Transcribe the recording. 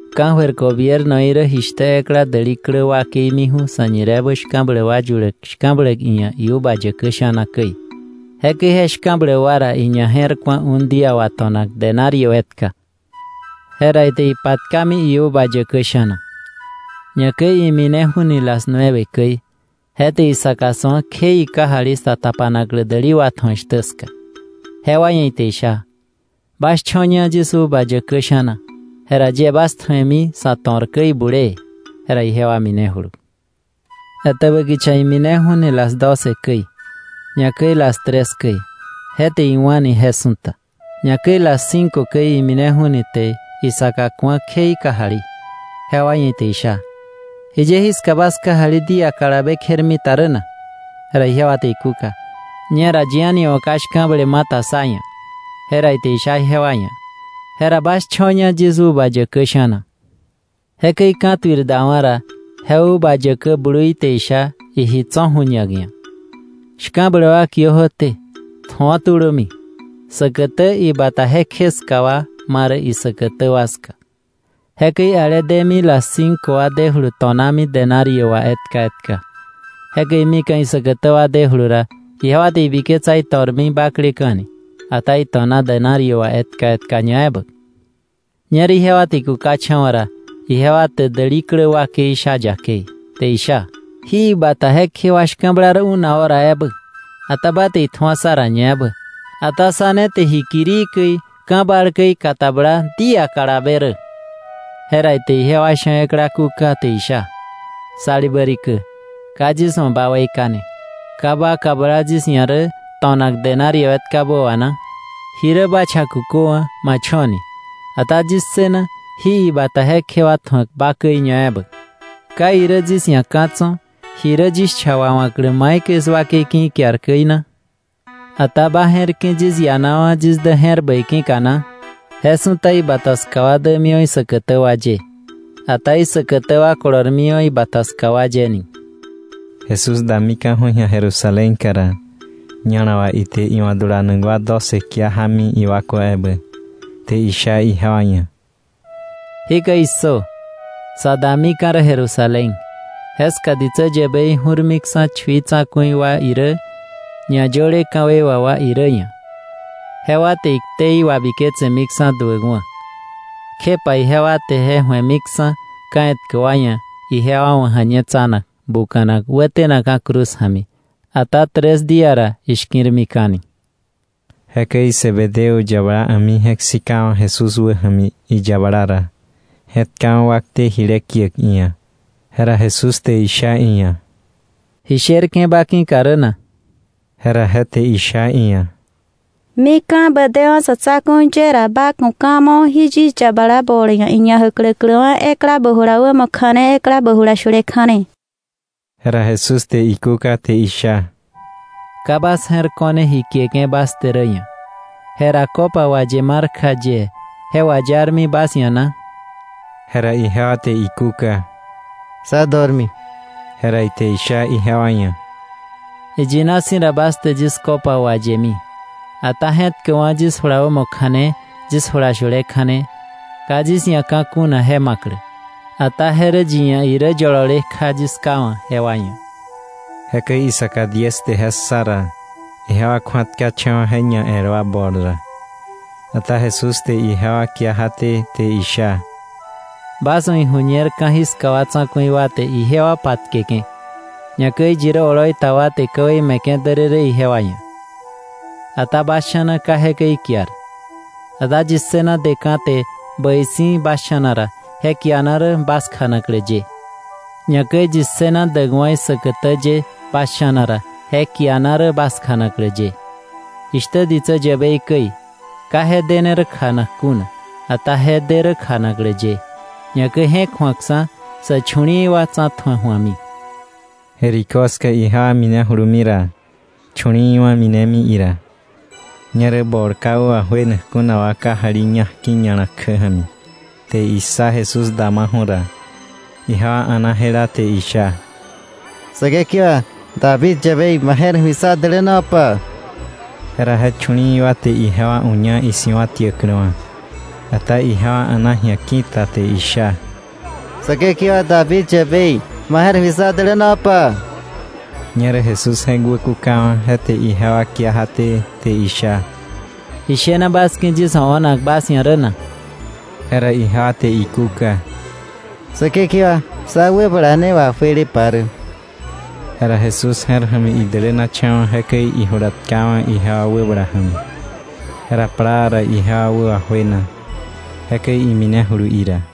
“Ka̱jöir gobiernoí rä jishtä ekla däli klä wakei miju̱ sa̱ñireebä shka̱bläk wa yuläk shka̱bläk iia̱ iuva yäkä sha̱na käi. Jekäi je shka̱bläk wa ra iñaje̱rku̱a un día wà to̱nak denario etka. Jera ite ipatkami iuva yäkä sha̱na. Ñakäi imineju̱ ni las nueve käi. Je te isaka su̱a kje ikajali sa tapanaklä däli watju̱ak shtä ska. Jewa ia̱ ite isha: ‘Bas cho̱ña yis uva yäkä sha̱na, jera yie bas tju̱emi sa̱ to̱r käi bulee.’ Jera ijewa minejulu. Etäbä kicha imineju̱ ni las doce käi, ñakäi las tres käi, je te iwa̱ni je su̱ta. Ñakäi las cinco käi imineju̱ ni te isaka ku̱a kje ikajali, jewa ia̱ ite isha: ‘¿Jiye jiska bas kajali día kalabe kjermita rä na?’ Jera ijewa te ikúka: ‘Ñera yi a̱ni wa̱ ka shka̱ble ma ta sá ia̱.’ Jera ite isha ijewa ia̱: ‘Jera bas cho̱ña yis uva yäkä sha̱na.’ “Jekäi ka̱tuir dawa̱ ra je uva yäkä blui te isha iji tso̱ ju̱ñak ia̱: ‘Shka̱bläk wa kiö jöté, tju̱o tulömi, säkätä ibata jekje ska wa ma rä isäkätä wa ska.’ Jekäi ale demi las cinco wa dejulu to̱nami denario wà etka etka. Jekäi mika̱ isäkätä wa dejulu ra, ijewa te ibiketsa ito̱rmi bakleka̱ ni; ata ito̱na denario wà etka etka ñaebä. Ñerä ijewa te ikukacha̱wa̱ ra, ijewa te däli klä wakei sha yakei, te isha: ‘Jí ibata jekje wa shka̱bla rä una hora ebä, ata ba te itju̱a sá ra ñaebä, ata sá ne te ji kirii käi, ka̱ bal käi katabla día kalabe rä. Jera ite ijewa sha̱ ekla kúka, te isha: ‘Salibä rikä, ka yis wa̱ ba weika̱ne. ¿Ka ba kabla yis ia̱ rä to̱nak denario etkabä wà na? Ji rä ba cha kuköwa̱, ma cho̱ ni, ata yis ssëna jí ibata jekje tju̱ak ba käi ñaebä. ¿Ka irä yis ia̱ ka̱ tso̱ ji rä yis cha wawa̱klä maikäi 'swakei ki̱ ikiar käi na? ¿Ata ma je̱r ki̱ yis ianawa̱ yis dä je̱r bäi ki̱ka na? “Je su̱ta ibata ska wa dämiwa̱ isäkätä wa ye, ata isäkätä wa kolormiwa̱ ibata ska wa ye ni.” Jesús damika̱ju̱ ji̱a Jerusalénka ra, ña̱la wà ite iwa̱ dulanak wa doce kia jámi iwakwa ebä, te isha ijewa ia̱: —¡Jikäi issö! Sa damika̱ rä Jerusalén, jeska ditsä yäbei ju̱rmiksa̱ chui tsa̱ku̱i wa irä, ñayöle ka̱wei wà wa irä ia̱, jewa te iktei wabiketsemiksa̱ duäkwa̱, kjepa ijewa te je ju̱emiksa̱ ka̱ etkä wa ia̱ ijewa wa̱ ja̱ñetsanak, buka̱nak, wätenakka̱ cruz ja̱mi. Ata tres día ra ishki̱rmika̱ni. Jekäi Zebedeo yabala a̱mi je̱k sikawa̱ Jesús wäja̱mi iyabala ra, je̱tkawa̱ wakte jile kiäk iia̱. Jera Jesús te isha iia̱: —¿Ji sherke̱ ba ki̱ka rä na? Jera je te isha iia̱: —Mika̱ ba dewa̱ sa̱ tsa̱ku̱i ye ra, ba ku̱ ka̱ mo jí yis yabala bol ia̱ iñajäkläkläwa̱ ekla bä jula wämo kja̱ne ekla bä jula shule kja̱ne. Jera Jesús te ikúka te isha: —Ka bas je̱r ko̱ne ji kieke̱ bas te rä ia̱. Jera copa waye mar kja yie ¿je wayarmi bas ia̱ na? Jera ijewa te ikúka: —Sá dormi. Jera ite isha ijewa ia̱: —Iyina si̱ ra, bas te yis copa wayemi, ata je̱tkäkwa̱ yis jula wämo kja̱ne yis jula shule kja̱ne, ka yis ia̱ ka̱ kuna je ma̱klä, ata je rä yi ia̱ irä yolole kja yis Ká wa̱ jewa ia̱. Jekäi isaka diez te je ssa ra, ijewa kju̱atkacha̱wa̱ je ñael wa bol ra. Ata Jesús te ijewa kia jaté, te isha: —Bas wa̱ ijuñer ka̱jiska wa tsa̱ku̱i wa te ijewa patkeke̱, ñakäi yi rä oloi ta wa te ka̱wei me̱ke̱ därërë ijewa ia̱. Ata bas sha̱na ka jekäi ikiar, ata yi ssëna deka̱ te bäi si̱ bas sha̱na ra, je kiana rä bas kjanaklä ye. Ñakäi yi ssëna däkwa̱ isäkätä ye bas sha̱na ra, je kiana rä bas kjanaklä ye, jishtä ditsä yäbei käi: Ka je dene rä kjanak kuna, ata je de rä kjanaklä ye, ñakäi je̱k ju̱akksa̱ sä chu̱li̱i̱ wa tsa̱tju̱ak ju̱ami. Jericó ska ijewa minejulumi ra, chu̱li̱i̱wa̱ minemi ira. Ñerä bol ka wä wajuenak kuna wa kajali ña̱jki̱ ña̱la kjä ja̱mi te issa Jesús damaju̱ ra, ijewa a̱na jela te isha: —¡Säkekewa, David yäbei, ma je̱r ja̱mi sá dälänopa! Jera je chu̱li̱i̱ wa te ijewa uña isi̱wa̱tiächa̱kläwa̱, ata ijewa a̱na ji̱a ki̱ta, te isha: —¡Säkekewa, David yäbei, ma je̱r ja̱mi sá dälänopa! Ñerä Jesús je̱k wäkukawa̱, je te ijewa kia jaté, te isha: —¿Ji shena bas ki̱ yis wa̱ o̱nak bas ia̱ rä na? Jera ijewa te ikúka: —Säkekewa, sá wäbala ne wajuelepa rä. Jera Jesús je̱r ja̱mi idälänacha̱wa̱, jekäi ijula tkawa̱ ijewa wäbala ja̱mi. Jera plaa ra ijewa wä wajuena, jekäi iminejulu ira.